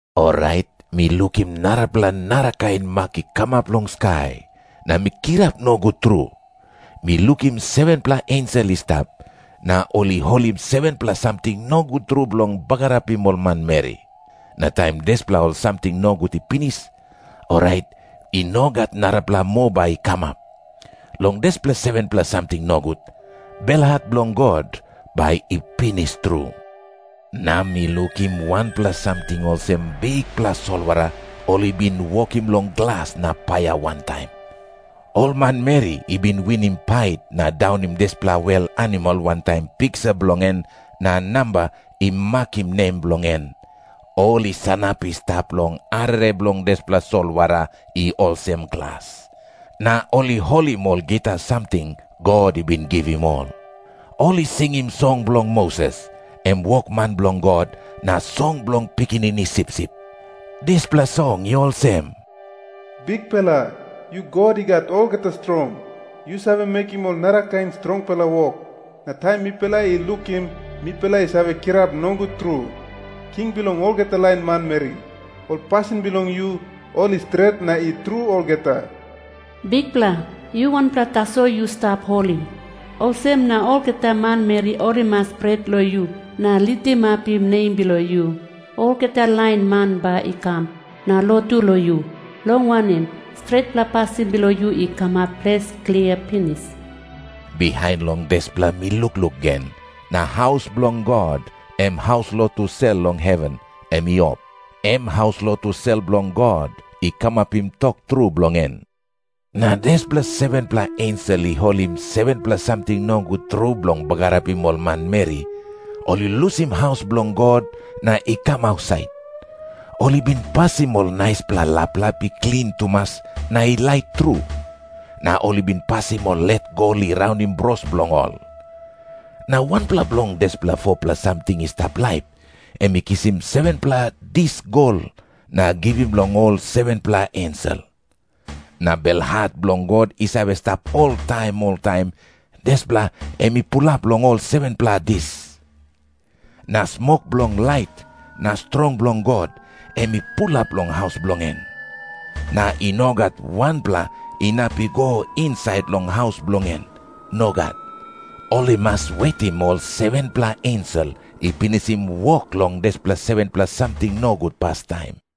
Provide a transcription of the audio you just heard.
Orait mi lukim narapela narakain mak i kamap long skai, na mi kirap nogut tru. Mi lukim 7-pela ensel i stap, na ol i holim 7-pela samting nogut tru bilong bagarapim ol manmeri. Na taim dispela ol samting nogut i pinis, orait i no gat narapela moa bai i kamap. Long dispela 7-pela samting nogut, belhat bilong God bai i pinis tru. Na mi lukim wanpela samting olsem bikpela solwara ol i bin wokim long glas na paia wantaim. Ol manmeri i bin winim pait na daunim dispela wel animal wantaim piksa bilong en na namba i makim nem bilong en, ol i sanap i stap long arere bilong dispela solwara i olsem glas, na ol i holim ol gita samting God i bin givim ol. Ol i singim song bilong Moses, em wokman bilong God, na song bilong Pikinini Sipsip. Dispela song i olsem, "Bikpela, yu God I Gat Olgeta Strong, yu save mekim ol narakain strongpela wok, na taim mipela i lukim mipela i save kirap nogut tru. King bilong olgeta lain manmeri, ol pasin bilong yu ol i stret na i tru olgeta. Bikpela, yu wanpela tasol yu stap holi. Olsem na olgeta manmeri ol i mas pret long yu na litimapim nem bilong yu. Olgeta lain man bai i kam na lotu long yu. Long wanem, stretpela pasin bilong yu i kamap ples klia pinis." Bihain long dispela mi lukluk gen, na haus bilong God, em haus lotu sel long heven, em i op. Em haus lotu sel bilong God i kamapim tok tru bilong en. Na dispela 7-pela ensel i holim 7-pela samting nogut tru bilong bagarapim ol manmeri, ol i lusim haus bilong God na i kam ausait. Ol i bin pasim ol naispela laplap i klin tumas na i lait tru. Na ol i bin pasim ol let gol i raunim bros bilong ol. Na wanpela bilong dispela 4-pela samting i stap laip, em i kisim 7-pela dis gol na givim long ol 7-pela ensel. Na belhat bilong God i save stap oltaim oltaim, dispela em i pulap long ol 7-pela dis. Na smok bilong lait na strong bilong God, em i pulap long haus bilong en. Na i no gat wanpela inap i go insait long haus bilong en. Nogat. Ol i mas wetim ol 7-pela ensel i pinisim wok long dispela 7-pela samting nogut pastaim.